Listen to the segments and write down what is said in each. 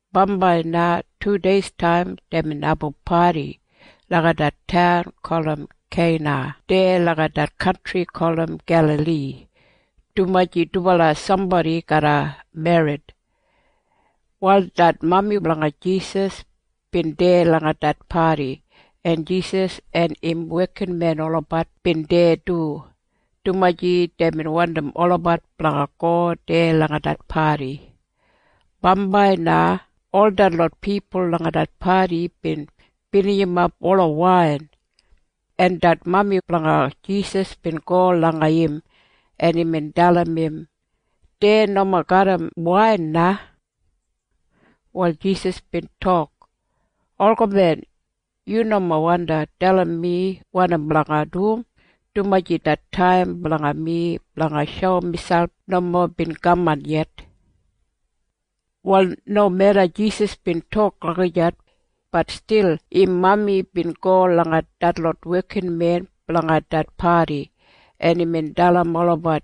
Bambai na tudeistaim deibin abum padi langa det taun gulum Keina deya langa det kantri gulum Gelali, dumaji dubala sambodi garra merrit. Wal det mami blanga Jisas bin deya langa det padi, en Jisas en im wekinmen olabat bin deya du, dumaji deibin wandim olabat blanga go deya langa det padi. Bambai na ol detlot pipul langa det padi bin binijimap ola wain, en det mami blanga Jisas bin go langa im, en imbin dalim im, “Dei nomo garram wain na.” Wal Jisas bin tok, “Olgamen, yu nomo wandi dalim mi wanim blanga dum, dumaji det taim blanga mi blanga shoum miselp nomo bin kaman yet.” Wal nomeda Jisas bin tok lagijat, bat stil im mami bin go langa detlot wekinmen blanga det padi, en imbin dalim olabat,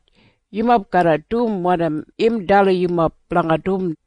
“Yumob garra dum wanim im dalim yumob blanga dum.”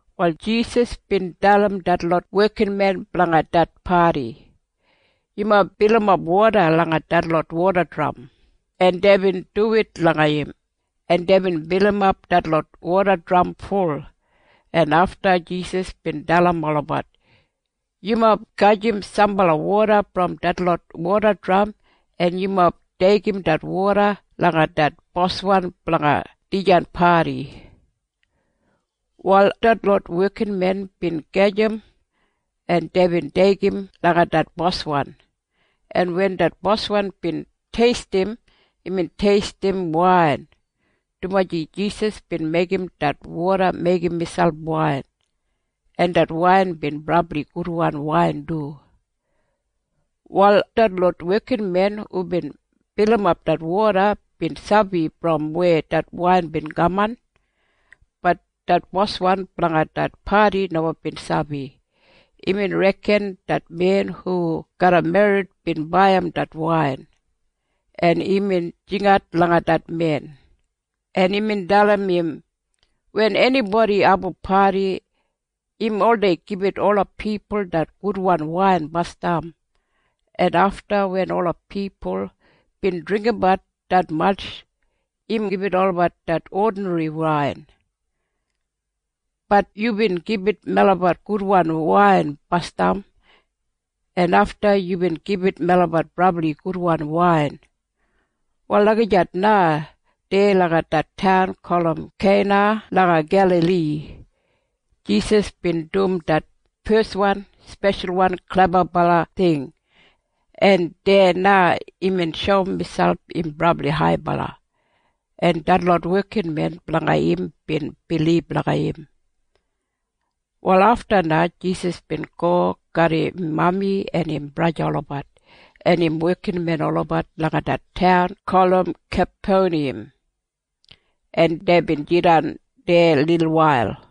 Wal Jisas bin dalim detlot wekinmen blanga det padi, “Yumob bilimap woda langa detlot wodadram.” En deibin duwit langa im, en deibin bilimap detlot wodadram ful. En afta Jisas bin dalim olabat, “Yumob gajim sambala woda brom detlot wodadram, en yumob deigim det woda langa det boswan blanga dijan padi.” Wal detlot wekinmen bin gajim, en deibin deigim langa det boswan, en wen det boswan bin teistim, imbin teistim wain, dumaji Jisas bin meigim det woda meigim miselp wain, en det wain bin brabli gudwan wain du. Wal detlot wekinmen hubin bilimap det woda bin sabi brom weya det wain bin kaman. Bat det boswan blanga det padi nomo bin sabi. Imbin reken det men hu garra merrit bin baiyim det wain, en imbin jingat langa det men, en imbin dalim im, “Wen enibodi abum padi, im oldei gibit ola pipul det gudwan wain basdam, en afta wen ola pipul bin dringgimbat detmatj, im gibit olabat det odinri wain. Bat yubin gibit melabat gudwan wain basdam, en afta yubin gibit melabat brabli gudwan wain.” Wal lagijat na deya langa det taun gulum Keina langa Gelali, Jisas bin dum det feswan speshal klebabala ting, en deya na imbin shoum miselp im brabli haibala, en detlot wekinmen blanga im bin bilib langa im. Wal afta na Jisas bin go garram im mami en im braja olabat en im wekinmen olabat langa det taun gulum Kapeniyam, en deibin jidan deya lilwail.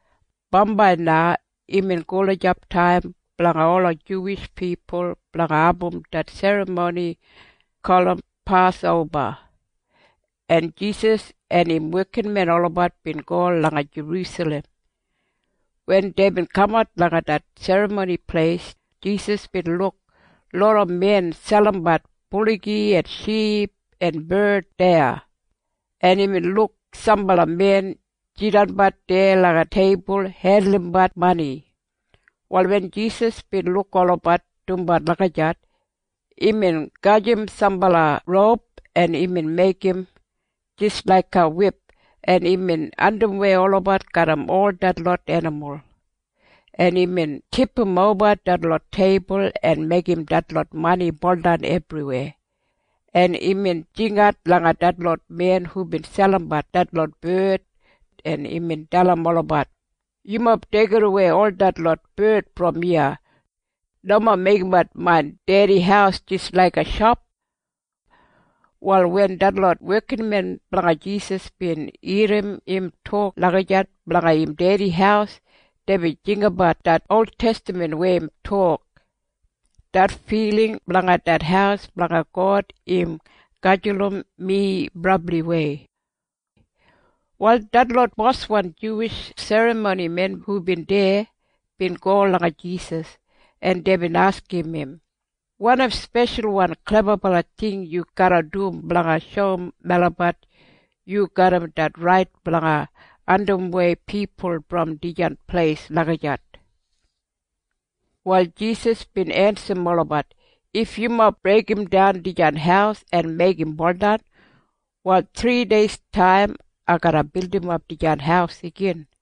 Bambai na imbin gulijap taim blanga ola Juwish pipul blanga abum det serramoni gulum Pasoba, en Jisas en im wekinmen olabat bin go langa Jerusalem. Wen deibin kamat langa det Serramoni Pleis, Jisas bin luk loda men selimbat buligi en ship en bard deya, en imbin luk sambala men jidanbat deya langa teibul hendulumbat mani. Wal wen Jisas bin luk olabat dumbat lagijat, imbin gajim sambala roup, en imbin meigim jis laiga wip, en imbin andimwei olabat garram ol detlot enimul, en imbin tipimoba detlot teibul en meigim detlot mani buldan ebriweya, en imbin jingat langa detlot men hubin selimbat detlot bard, en imbin dalim olabat, “Yumob deigidawei ol detlot bard brom iya! Nomo meigimbat main Dedi haus jis laiga shop!” Wal wen detlot wekinmen blanga Jisas bin irrim im tok lagijat blanga im Dedi haus, deibin jinggabat det oltestaman weya im tok, “Det filing blanga det haus blanga God im gajulum mi brabliwei.” Wal detlot boswan Juwish serramonimen hubin deya bin go langa Jisas, en deibin askim im, “Wanim speshalwan klebabala ting yu garra dum blanga shoum melabat yu garram det rait blanga andimwei pipul brom dijan pleis lagijat?” Wal Jisas bin ensim olabat, “If yumob breigimdan dijan haus en meigim buldan, wal thrideistaim ai garra bildimap dijan haus igin.”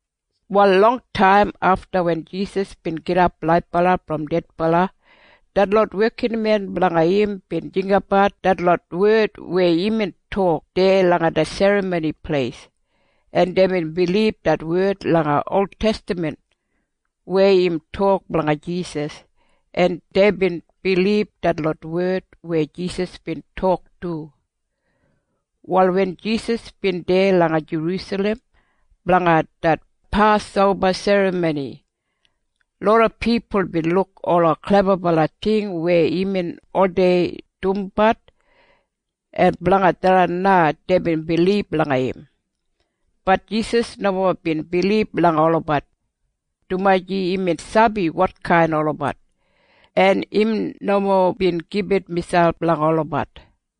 Wal longtaim afta wen Jisas bin gidap laibala brom dedbala, detlot wekinmen blanga im bin jinggabat detlot wed weya imbin tok deya langa det Serramoni Pleis, en deibin bilib det wed langa oltestaman weya im tok blanga Jisas, en deibin bilib detlot wed weya Jisas bin tok du. Wal wen Jisas bin deya langa Jerusalem blanga det Pasoba Serramoni, loda pipul bin luk ola klebabala ting weya imbin oldei dumbat, en blanga tharran na deibin bilib langa im. Bat Jisas nomo bin bilib langa olabat, dumaji imbin sabi wotkain olabat, en im nomo bin gibit miselp langa olabat.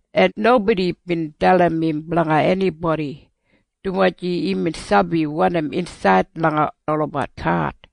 En nobodi bin dalim im blanga enibodi, dumaji imbin sabi wanim insaid langa olabat hat.